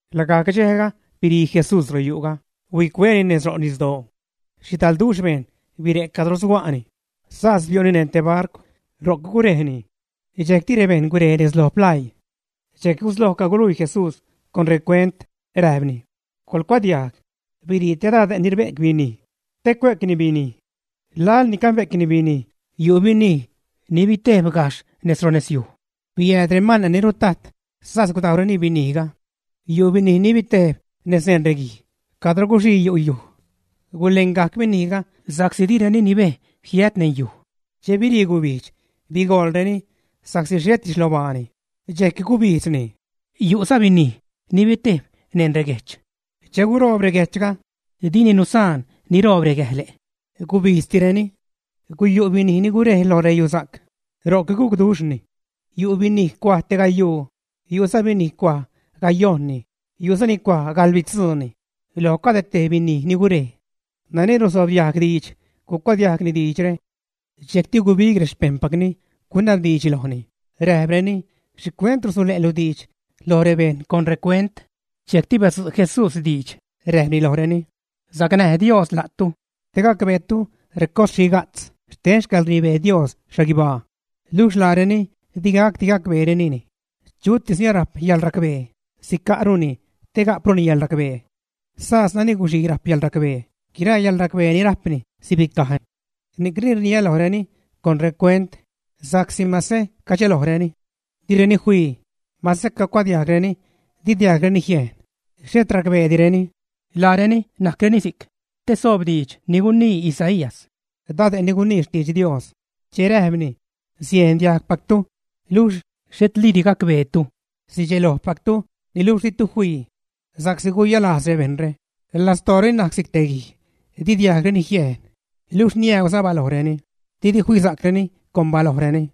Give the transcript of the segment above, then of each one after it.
Lagajc dxejga birii Jesús royu'ga, huicueni nez ro' nisdoo. Xhidalduxh bejṉ bire' cadro suga'ni, sas biu'ni neṉ te barcw, ro'c gurejni. Dxejcti rebejṉ gurej nez lo plaii. Dxejc gusloj caguluii Jesús con recuent, räjpni: ―Coḻcuadiajg. Birii te dade' ni rbe'c binij te cue'cni binij. Laḻ ni cabe'cni binij yu' binij ni bitejb gajxh nez ro' nesiuj, biääd remane' ni rutajt, sas gudajwreni binijga. Yu' binij ni bitejb nez neṉ reguij cadro guxii yu' yuj. Gulengajc binijga sa'csi direni nibej jiät neṉ yuj. Che birii gubijdx, bigoḻreni sa'csi xhetiza xlobaani, dxejc gubijdzni. Yu'za binij ni bitejb neṉ reguejch. Che guroob reguejchga, dini nusaan niroob regäjle', gubijdztireni. Guyu' binij ni gurej lo reyusa'c, ro'c gucduxhni. Yu' binij cuaj te gayuu, yu'za binij cuaj gayojṉni, yu'za ni cuaj gaḻbitzuuni loj cade tej binij ni gurej. Nani rsobdiajg diidx gucuadiajgni diidxre. Dxejcti gubig rexpejṉpacni, gunabdiidx lojni, räjpreni: ―¿Xhicuent rusule'lu diidx loj rebejṉ con recuent? Dxejcti badzu' Jesús diidx rajpni lojreni: ―Sacnäj Dios la'tu te gacbeetu recos xhiga'tz xten xcäḻrnibee Dios xhaguibaa, luxh laareni digacdi gacbeerenini. Chutis ni arajp yäḻracbee, sica'runi te gapruni yäḻracbee. Sas nani guxii rajp yäḻracbee, guiraa yäḻracbee ni rajpni sibicaj. Ni'cni rniä lojreni con recuent sa'csi mase cadxelojreni, direni fii, mase cacuadiajgreni di diajgreni jiejn, xhet racbeedireni. Laareni najcreni si'c te soob diidx ni gunii Isaías, dade' ni gunii xtidx Dios, che räjpni: Siejn diajgpactu, niluxh xhetliidi gacbeetu, sidxelojpactu, niluxh ditu fii. Sa'csi guyalajz rebejṉre, lastooreni najc si'c te guij, di diajgreni jiejn, luxh niäuza balojreni, didi fisa'creni con balojreni,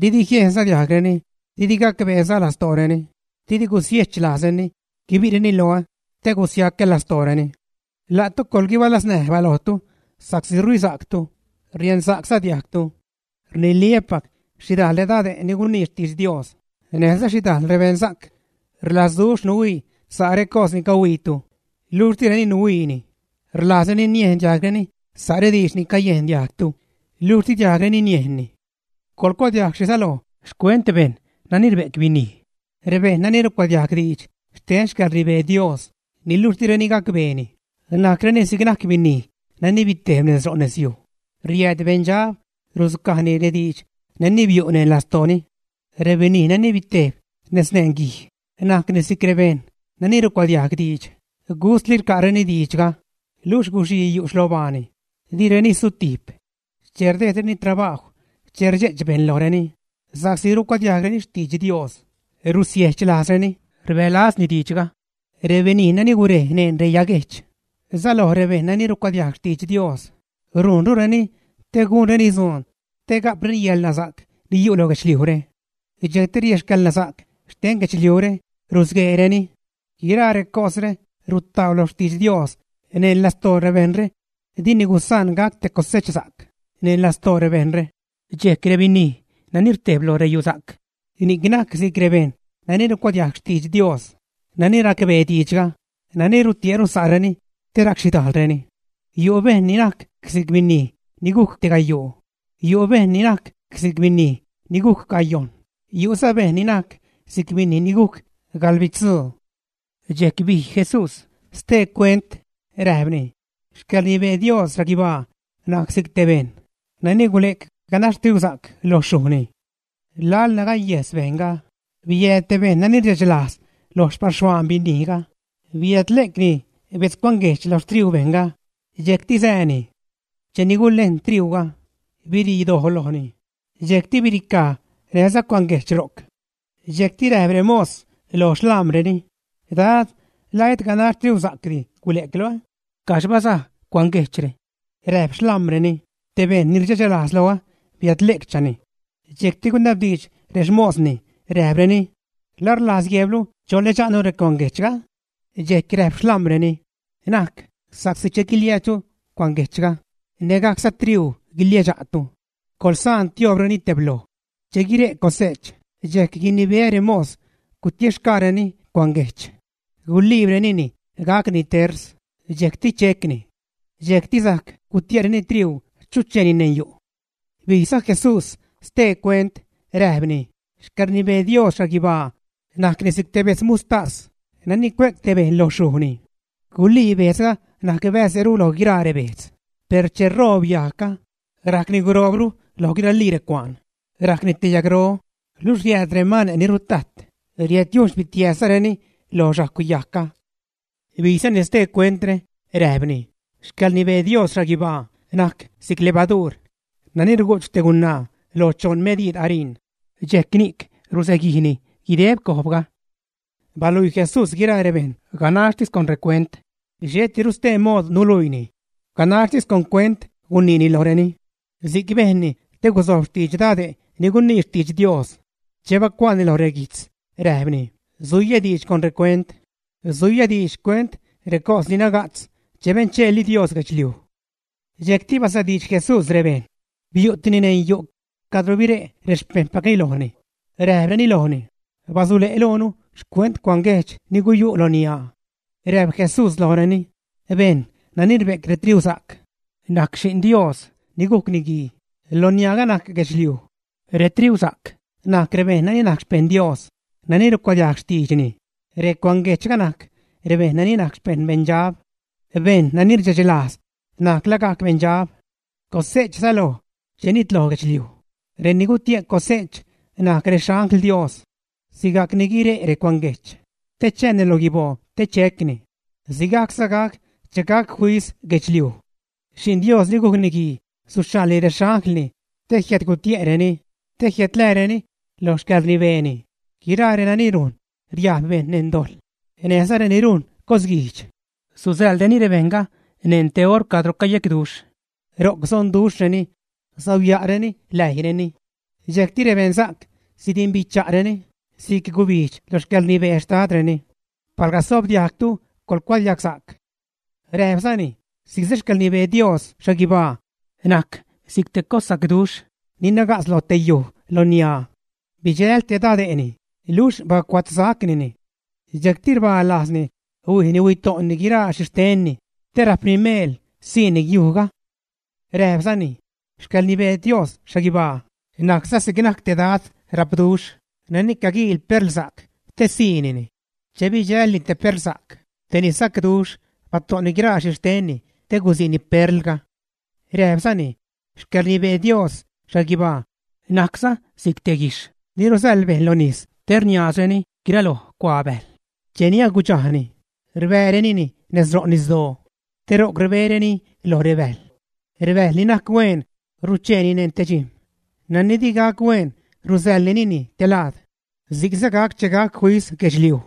didi jiejnza diajgreni, didi gacbeeza lastooreni, didi gusiejch lajzreni guibi'reni loä te gusiacä lastooreni. ’La'tu coḻguibalaznäj balojtu sa'csi rhuisa'ctu, riensa'cza diajgtu. Rniliä́pac, xhidajl redade' ni gunii xtidx Dios, näjza xhidajl beṉsa'c rlazduxh nuhuii sa' recos ni cahuiitu, luxh direni nuhuiini, rlajzreni niejn diajgreni sa' rediidx nani cayejn diajgtu, luxh di diajgreni niejnni. ’Coḻcuadiajg xhi säloj xcuent bejṉ nani rbe'c binij. Rebejṉ nani rucuadiajg diidx xten xcäḻrnibee Dios, niluxh direni gacbeeni, najcreni si'c najc binij nani bitejb nez ro' nesyuj; riääd beṉdxab rudzucajni rediidx nani biu' neṉ lastooni. Rebinij nani bitejb nez neṉ reguij, najc si'c rebejṉ nani rucuadiajg diidx, gustli rca'reni diidxga, luxh guxii yu' xlobaani, direni sutijp. Che rdejdreni trabajw, che rdxe'ch bejṉ lojreni, sa'csi rucuadiajgreni xtidx Dios, rusiejch lajzreni, rbälazni diidxga. Rebinij nani gurej neṉ reyaguejch säloj rebejṉ nani rucuadiajg rextidx Dios rujnrureni te gunreni dzuun te ga'preni yäḻnasa'c ni yu' lo guedxliujre. Dxejcti rexcäḻnasa'c xten guedxliujre rusgueereni. Guiraa recosre rutau lo xtidx Dios neṉ lastoo rebejṉre, dini gusaan gac te cosechsa'c neṉ lastoo rebejṉre. Dxejc rebinij nani rtejb lo reyusa'c, ni'c najc si'c rebejṉ nani rucuadiajg xtidx Dios, nani racbee diidxga, nani rutie'ru sa'reni te racxhidajlreni. Yu' bejṉ ni najc si'c binij ni gujc te gayuu; yu' bejṉ ni najc si'c binij ni gujc gayojṉ; yu'za bejṉ ni najc si'c binij ni gujc gaḻbitzuu. Dxejc bij Jesús stee cuent, räjpni: ―Xcäḻrnibee Dios xhaguibaa najc si'c te bejṉ nani gule'c ganax triusa'c lo xyujni. Laḻ nagaguejs bejṉga, biääd te bejṉ nani rdxe'ch lajz loj xpaxhuaan binijga, biädle'cni bedz cuanguejch lo xtriuu bejṉga, dxejcti sääni. Cheni gulejn triuuga, birii doj lojni, dxejc biricaj näjza cuanguejch ro'c. Dxejcti räjp remos lo xḻam̲reni; “Dad, ¿la et ganax triusa'c di gule'clu, ä? ¿Caxh bazaj cuanguejchre?” Räjp xlam̲reni: “Te bejṉ ni rdxechlajz loä biädle'cchani.” Dxejcti gunabdiidx rexmosni räjpreni: “¿La rlajz guejblu cholädxa'nu recuanguejchga, ä?” Dxejc räjp xlam̲reni: “Na'c, sa'csi che guiliäädxtu cuanguejchga, nägajcza triuu guiliäädxtu. Coḻsaan tioobreni tebloj. Che guire' cose'ch, dxejc guinibeä remos gutiexgaareni cuanguejch, guliibrenini gacni ters, dxejcti checni. Dxejcti sajc gutie'reni triuu chucheeni neṉ yu'.” Bijza Jesús stee cuent räjpni: ―Xcäḻrnibee Dios xhaguibaa najcni si'c te bedz muxhtas nani cue'c te bejṉ lo xyujni. Gulii bejdzga najc bäze'ru loj guiraa rebejdz, per che roob yajgga, rajcni guroobru loj guiralii recuaan, rajcni te yagro, luxh riääd remane' ni rutajt riädyujn xpitiääzreni lo xajcw yajgga. Bijzani stee cuentre, räjpni: ―Xcäḻrnibee Dios xhaguibaa najc si'c levaduur nani rugu'ch te gunaa lo choṉ mediid ariṉ, dxejc ni'c rusaguijni guideb cojbga. Baluii Jesús guiraa rebejṉ ganaxtis con recuent, xhetiru stee mood nuluiini, ganaxtis con cuent guniini lojreni. Si'c bejnni te guzojb xtidx dade' ni gunii xtidx Dios che bacuaani lo reguijtz, räjpni: Suiyä diidx con recuent, suiyä diidx xcuent recos ni naga'tz che bencheeli Dios guedxliuj. Dxejcti basadiidx Jesús rebejṉ, biu'tini neṉ yu' cadro bire' rexpejṉpacni lojni, räjpreni lojni: ―Basule' loonu xcuent cuanguejch ni guyu' loniaa. Räjp Jesús lojreni: ―Bejṉ nani rbe'c retriusa'c, najc Xi'n Dios ni gujc Niguii; loniaaga najc guedxliuj; retriusa'c najc rebejṉ nani najc xpejṉ Dios, nani rucuadiajg xtiidxni; recuanguejchga najc rebejṉ ni najc xpejṉ beṉdxab. Bejṉ nani rdxe'ch lajz najc lagajc beṉdxab. Cose'ch säloj che nitloj guedxliuj; reni gutie' cose'ch najc rexangl Dios. Sigacni guire' recuanguejch te chääni lo guiboo te checni, sigajcza gac che gac fis guedxliuj. Xi'n Dios ni gujc Niguii suxhaḻ rexanglni te jiädgutie'reni, te jiädlääreni lo xcäḻrnibeeni guiraa renani rujn riajb bejṉ neṉ dojḻ, näjza reni rujn cosguijdx. Susäḻreni rebejṉga neṉ te oṟ cadro cayecduxh. Ro'c sonduxhreni, sauya'reni läijyreni. Dxejcti rebeṉsa'c sidimbicha'reni si'c gubijdx lo xcäḻrnibee Xtadreni. Palga sobdiajgtu, coḻgucuadiagsa'c. Räjpzani: ―Si'cza xcäḻrnibee Dios xhaguibaa najc si'c te cossacduxh ni naga'tz lo te yuj loniaa. Bidxäl te dade'ni, luxh bacuatzsacnini. Dxejcti rbalajzni, huijni, huito'ni guiraa xhixtenni te rajpni meel siini yujga. Räjpzani: ―Xcäḻrnibee Dios xhaguibaa najcza si'c najc te dad rapduxh nani caguiil perlsa'c te siini. Che bidxälni te perlsa'c, tejni sacduxh, bato'ni guiraa xhixtenni te gusiini perlga. Räjpzani: ―Xcäḻrnibee Dios xhaguibaa najcza si'c te guijxh ni rusäḻ bejṉ lo nis te rniaazreni guiraloj cuaa bäjl. Cheni agudxajni, rbäärenini nez ro' nisdoo, te ro'c rbereni loj rebäjl. Rebäjl ni najc hueen rucheeni neṉ te dxijm̲; nani di gac hueen rusäḻrenini te laad. Si'cza gac che gac fis guedxliuj;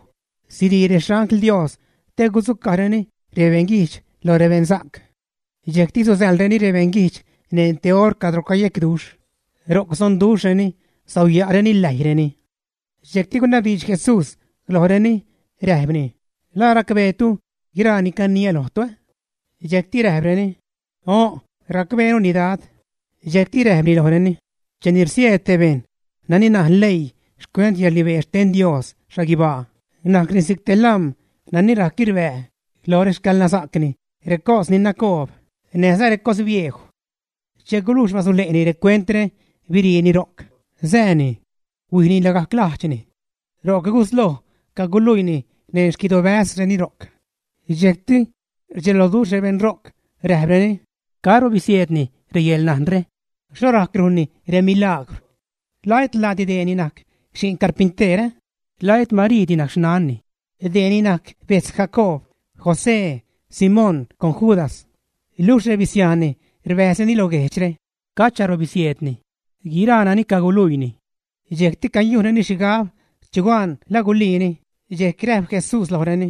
sirii rexangl Dios te sudzucajreni rebeṉguijdx lo rebeṉsa'c. Dxejcti susäḻreni rebeṉguijdx neṉ te oṟ cadro cayecduxh; ro'c sonduxhreni, sauya'reni läjyreni. Dxejcti gunabdiidx Jesús lojreni, räjpni: ―¿La racbeetu guiraa ni caniä lojtu, ä? Dxejcti räjpreni: ―O', racbeenuni Dad. Dxejcti räjpni lojreni: ―Cheni rsieed te bejṉ nani najn leii xcuent yäḻrnibee xten Dios xhaguibaa, najcni si'c te lam̲ nani rajc rbää lo rexcäḻnasa'cni recos ni nacoob, näjza recos biejw. Che gulujx basule'ni recuentre, biriini ro'c, sääni. Huijni lagajc lajdxni. Ro'c gusloj caguluiini neṉ xquidobäzreni ro'c. Dxejcti rdxeloduxh rebeṉ ro'c, räjpreni: ―¿Caro bisieedni reyäḻnajnre? ¿Xho rajc rujnni remilagwr? ¿La et laadi dee ni najc xi'n carpinteer, ä? ¿La et Mariidi najc xnanni? Dee ni najc bejtz Jacoob, José, Simón con Judas. Luxh rebisiajnni rbäjzreni lo guejdxre. ¿Cacharo bisieedni guiraa nani caguluiini? Dxejcti cayujnreni xhigab chugan la guliini, dxejc räjp Jesús lojreni: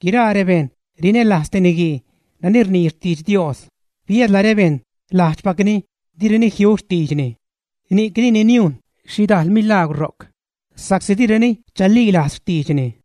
―Guiraa rebejṉ rinälajz te niguii nani rnii xtidx Dios, biädla rebeṉ lajdxpacni direni jiu xtiidxni. Ni'c dini niujn xhidal milagwr ro'c sa'csi direni chalilajz xtiidxni.